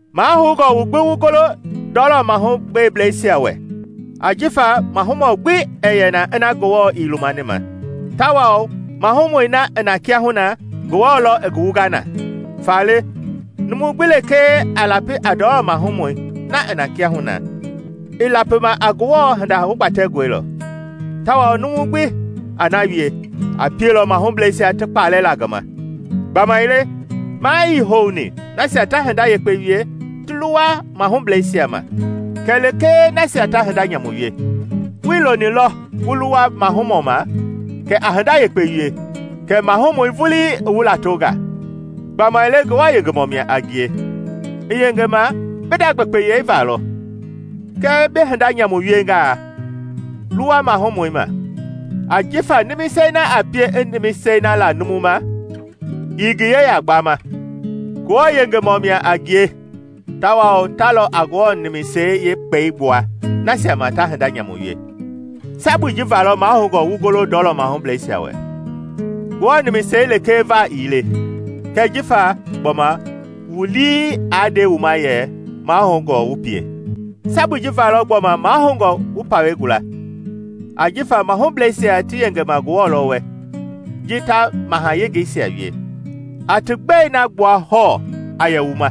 Mahoungɔ wu gbi wu golo ndɔlɔ mahubleisia wɛ, ajifa mahumɔ gbi ɛɛ yɛ na ina Ngewɔ ii lumani ma, tawao mahumɔi na i na kiahuna, Ngewɔ lɔ i ngi wunga na. Faale numu gbi lekee a lapi a ndɔlɔ mahumɔi na i na kiahuna, i lapima a Ngewɔ hinda hugbatɛngɔi lɔ, tawao numu gbi a na wie, a pielɔ mahubleisia ti kpalɛ la ngi ma. Gbamaile maa ii houni nasia ta hinda yekpe wie ti luwa mahubleisia ma kɛlee nasia ta hinda nyamu wie. Wuii lonilɔ wu luwa mahumɔ ma, kɛ a hinda yekpe wie, kɛ mahumɔi vuii i wu latonga. Gbamaile Ngewɔ yengemɔ mia a ngie, i yengema bi nda gbekpeyei valɔ. Kɛɛ bi hinda nyamu wiengaa, luwa mahumɔi ma, ajifa nimisei na a pie i nimisei la numu ma ii ngi yeya gbama. Ngewɔ yengemɔ mia a ngie tawao ta lɔ a Ngewɔ nimisei yeekpɛi gbua nasia ma ta hinda nyamu wie. Sabui ji va mahoungɔ wu golo ndɔlɔ mahubleisia wɛ - Ngewɔ nimisei lekee va ii le, kɛɛ jifa gbɔma wu lii a nde wu ma yɛ mahoungɔ wu pie. Sabui ji va lɔ gbɔma mahoungɔ wu pawɛi gula, ajifa mahubleisia ti yengema Ngewɔ lɔ wɛ ji ta mahayengeisia wie. A ti gbɛi na gbua hɔɔ a yɛ wu ma;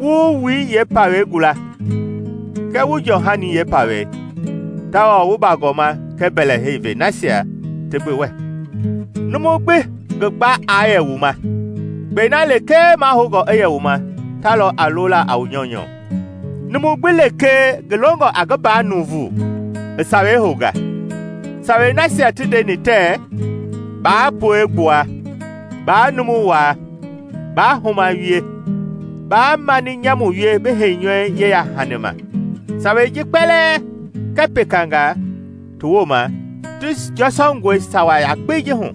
wu wu wui yeepawei gula kɛɛ wu jɔɔhani yeepawei, tawao wu bagɔma kɛɛ mbɛlɛhei ve nasia ti gbi wɛ. Numu gbi ngi gba aa yɛ wu ma; kpɛi na lekee mahoungɔ i yɛ wu ma ta lɔ a lola a wu nyɔunyɔ. Numu gbi lekee ngi longɔ a ngi mbaa nuuvu, i sawei hounga. Sawei nasia ti ndeni tɛɛ, “Baa pue gbua; baa numu waa; baa huma wie; baa mani nyamu wie bi heinyɔui yeya-hani ma,” sawei ji kpɛlɛɛ kɛɛ pekanga ti wooma ti jɔsɔngɔe sawa yakpei ji hu,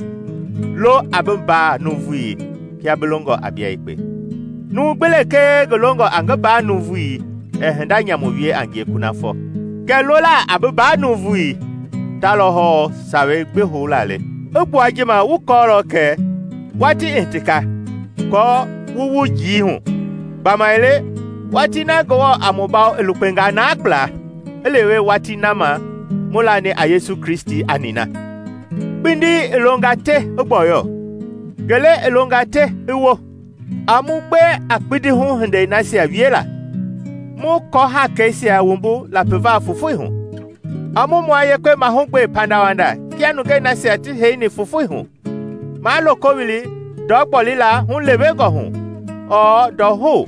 “Lo a bi mbaa nuuvui kia bi longɔ a bia yekpe.” Numu gbi lekee ngi longɔ a ngi mbaa nuuvui ɛɛ hinda nyamu wie a ngie kunafɔ. Kɛ lola a bi mbaa nuuvui ta lɔ hɔɔ sawei gbi houla le. I gbua ji ma wu kɔɔlɔ kɛ, watii i hitinga kɔɔ wu wu njii hu. Gbamaile watii na Ngewɔ a mu bawo i lukpenga naa kpla i lewe watii na ma mu lani a Yesu Kristi a nina. Kpindi i longa te i gbɔyɔ, ngele i longa te i wo. A mu gbe a kpindihu hindeisia wiela, mu kɔhaakeisia wumbu lapiva fofoi hu. A mu mua yekpe mahugbe pandawanda kia nungei nasia ti heini fofoi hu; maa loko wili ndɔ gbolila hulewengɔ hu ɔɔ ndɔhou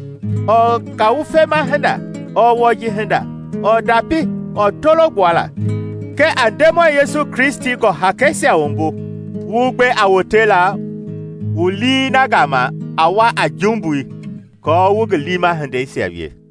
ɔɔ ngawufema hinda ɔɔ wɔji hinda ɔɔ ndapi ɔɔ tolo gbuala. Kɛɛ a Ndemɔi Yesu Kristi gɔ-haakeisia wumbu, wu gbe a wotela wu lii na gama a wa a jumbui, kɔɔ wu ngi liima hindeisia wie.